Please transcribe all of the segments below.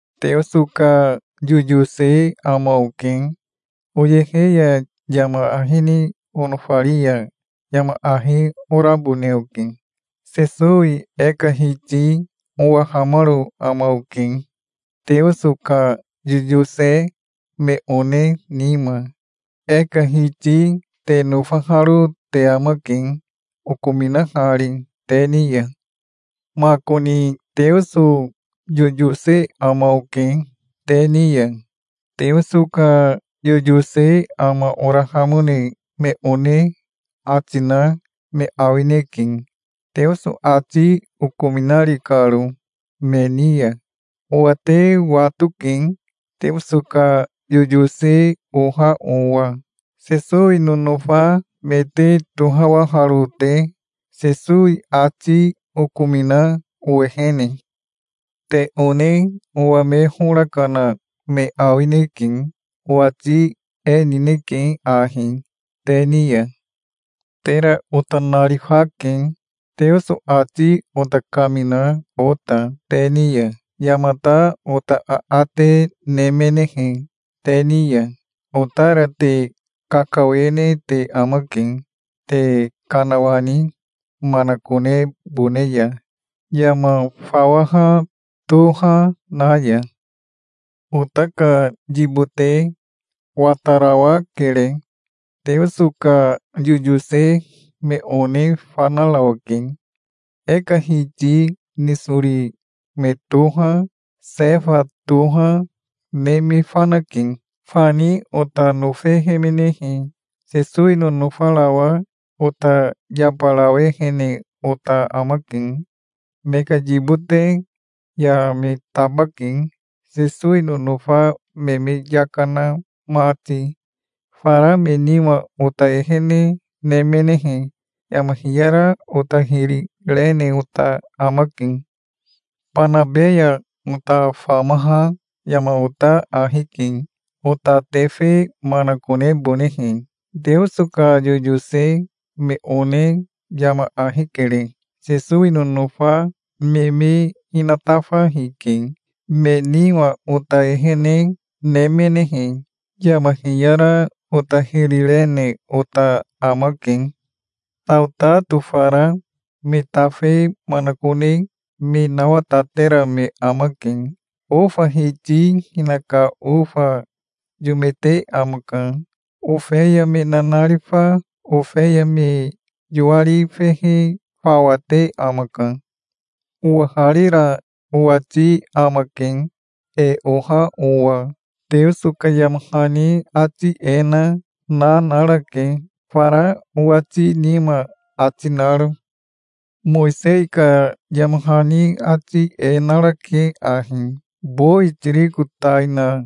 Teoso ka yoyose ama oke. Oyehe ya yama ahi ni onofari ya yama ahi orabone oke. Sesowi e ka Hiti owahamaro ama oke, Teoso ka yoyose me one nima. E ka Hiti te nofaharo te amake, okominahari te ni ya. Makoni Teoso yoyose ama oke te ni ya. Teoso ka yoyose ama orahamone me one ati na me awineke, Teoso ati okominari karo me ni ya. Owa te watoke, Teoso ka yoyose oha owa, Sesowi nonofa me te tohawaharo te, Sesowi ati okomina owehene. Te one owa me hora kana me awineke. Owati e nineke ahi te ni ya: Tera ota narifake, Teoso ati ota kamina ota te ni ya. Yamata ota aate nemenehe te ni ya, otara te kakawene te amake te kanawani manakonebone ya, yama fawaha toha na ya. Ota ka yibote watarawakere. Teoso ka yoyose me one fanarawake. E ka Hiti nisori me toha, Sefa toha, ne me fanake. Fani ota nofehemenehe, Sesowi nonofarawa ota yabarawehene ota amake. Me ka yibote ya me tabake Sesowi nonofa me me yaka na mati. Fara me nima ota ehene nemenehe yama hiyara ota hiri rene ota amake. Banabe ya ota famaha yama ota ahi ke, ota tefe manakonebonehe. Teoso ka yoyose me one yama ahi kere. Sesowi nonofa me me hinatafa hike. Me nima ota ehene nemenehe, yama hiyara ota hiri rene ota amake. Saotato fara me tafe manakone me nawatatera me amake. Ofa hiti hinaka ofa yome te amaka. Ofeya me nanarifa ofeya me yoari fehe fawate amaka. Owaharira owati amake, e oha owa. Teoso ka yama hani ati e na na narake, fara owati nima ati naro. Mowisei ka yama hani ati e narake ahi: "Bowi tiriko tai na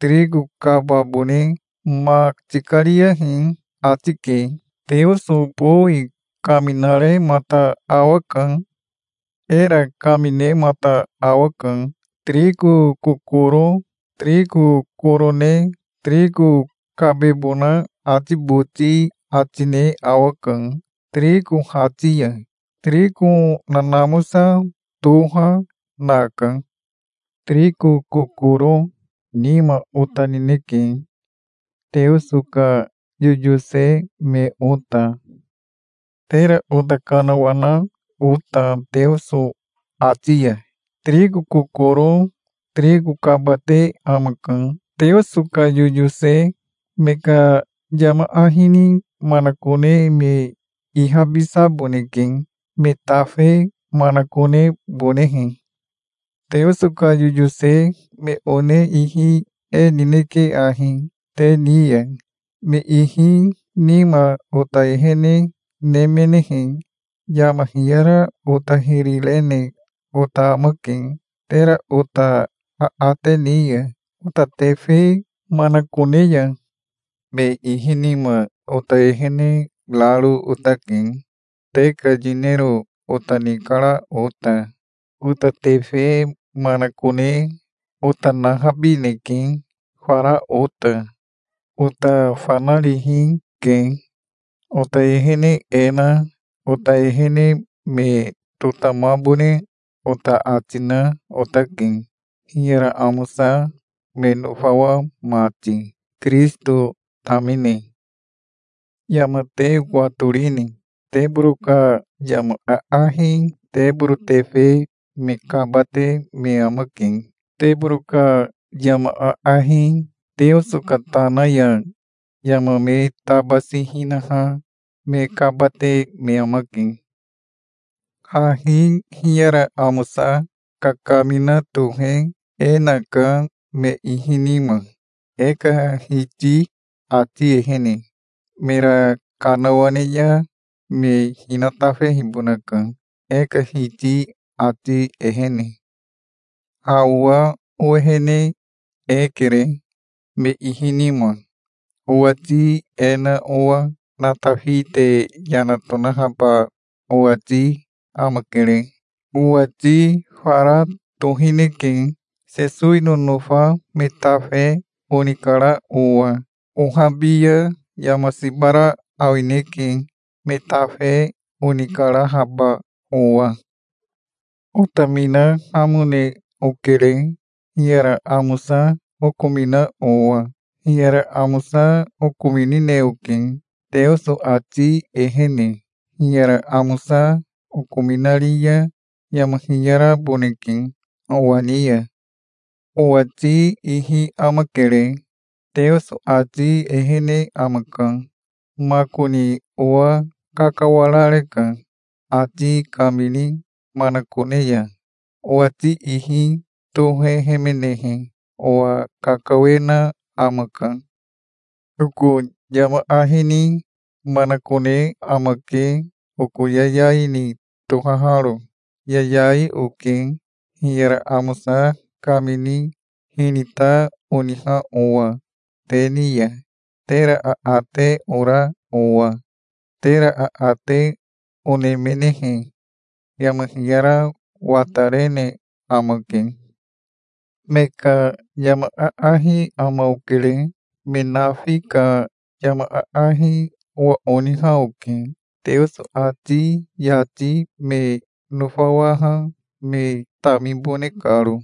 tiriko kababone ma tikariyahi", ati ke. Teoso bowi kaminaremata awaka. Era kaminemata awaka. Tiriko kokoro tiriko koro ne tiriko kabebona ati boti ati ne awaka, tiriko hati ya. Tiriko nanamosa toha, naka. Tiriko kokoro nima ota nineke, Teoso ka yoyose me ota, tera ota kanawana ota Teoso ati ya. Tiriko kokoro tiriko kabate amaka. Teoso ka yoyose me ka yama ahi ni manakone me ihabisaboneke, me tafe manakonebonehe. Teoso ka yoyose me one ihi e nineke ahi te ni ya. Me ihi nima ota ehene nemenehe, yama hiyara ota hiri rene ota amake, tera ota aate ni ya ota tefe manakone ya. Me ihi nima ota ehene raro otake, te ka yinero ota nikara ota. Ota tefe manakone ota nahabineke, fara ota. Ota fanarihi ke. Ota ehene e na ota ehene me totamabone ota ati na otake, hiyara amosa me nofawa mati, Kirisito tamine. Yama te watorini? Teboro ka yama aahi teboro tefe me kabate me amake. Teboro ka yama aahi Teoso ka tana ya yama me tabasi hinaha me kabate me amake. Hahi hiyara amosa kakamina tohe e naka me ihi nima, e ka Hiti ati ehene. Mera kanawane ya me hinatafehibonaka e ka Hiti ati ehene. Ha owa owehene e kere me ihi nima. Owati e na owa natafi te yana tonahaba owati amakere. Owati fara tohineke, Sesowi nonofa me tafe onikara owa. Ohabi ya yama siba ra awineke, me tafe onikarahaba owa. Otaminahamone okere, hiyara amosa okomina owa. Hiyara amosa okominine oke, Teoso ati ehene. Hiyara amosa okominari ya yama hiyaraboneke owa ni ya. Owati ihi amakere. Teoso ati ehene amaka. Makoni owa kakawarareka, ati kamini manakone ya. Owati ihi tohehemenehe owa kakawena amaka. Oko yama ahi ni manakone amake oko yayai ni tohaharo. Yayai oke, hiyara amosa kamini hinita oniha owa te ni ya, tera aate ora owa. Tera aate onemenehe yama hiyara watarene amake. Me ka yama aahi ama okere. Me nafi ka yama aahi owa oniha oke, Teoso ati yati me nofawaha me tamibone karo.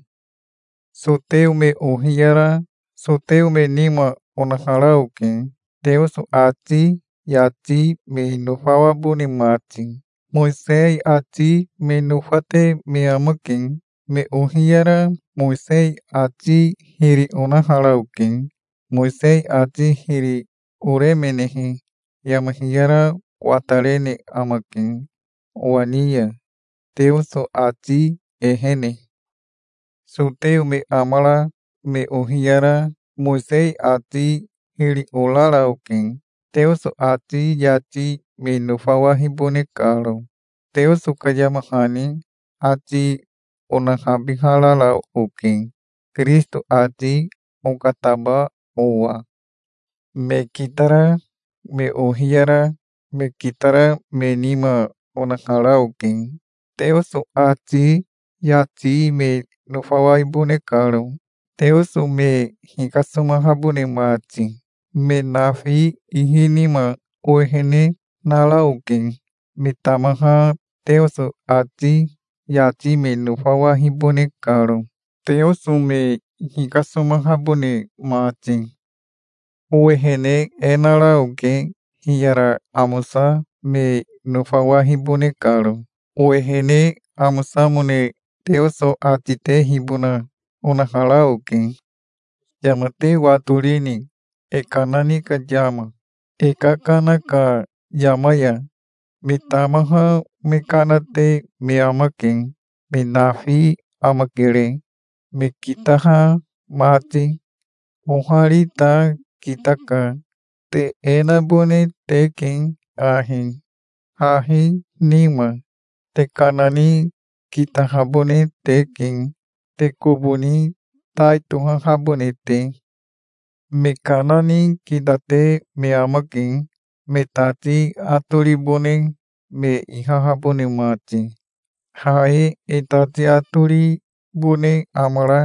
Soteo me ohiyara soteo me nima onahara oke, Teoso ati yati me nofawabone mati. Mowisei ati me nofate me amake. Me ohiyara Mowisei ati hiri onahara oke. Mowisei ati hiri oremenehe yama hiyara watarene amake owa ni ya Teoso ati ehene. Soteo me amara me ohiyara Mowisei ati hiri orara oke, Teoso ati yati me nofawahibone karo. Teoso ka yama hani ati onahabiharara oke, Kirisito ati okataba owa. Me kitara me ohiyara me kitara me nima onahara oke, Teoso ati yati me nofawaibone karo, Teoso me hikasomahabone mati. Me nafi ihi nima owehene nara oke, me tamaha Teoso ati yati me nofawahibone karo, Teoso me hikasomahabone mati. Owehene e nara oke, hiyara amosa me nofawahibone karo. Owehene amosamone Teoso ati tehibona onahara oke. Yama te watorini, e kana ni ka yama? E kakana ka yama ya me tamaha me kana te me amake. Me nafi amakere, me kitaha mati. Ohari ta kitaka. Te e nabone teke ahi, hahi nima. Te kana ni kitahabone teke, te kobo ni tai tohahabone te. Me kana ni kitate me amake, me tati atoribone me ihahabone mati. Ha e e tati atoribone amara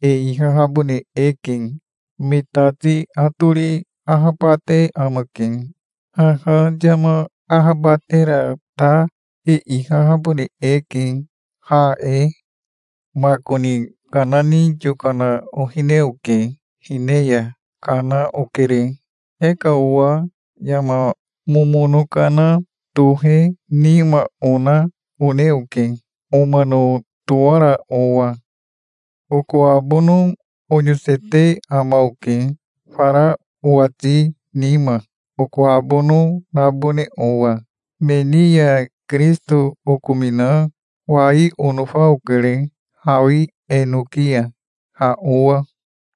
e ihahabone eke. Me tati atori ahabate amake. Haha yama ahabatera ta e ihahabone eke, ha e. Makoni kana ni yokana ohine oke. Hine ya kana okere. E ka owa yama momono kana tohe nima ona one oke, omano towara owa. Oko abono oyosete ama oke, fara owati nima oko abono nabone owa. Me ni ya Kirisito okomina wai onofa okere hawi enoki ya, ha owa.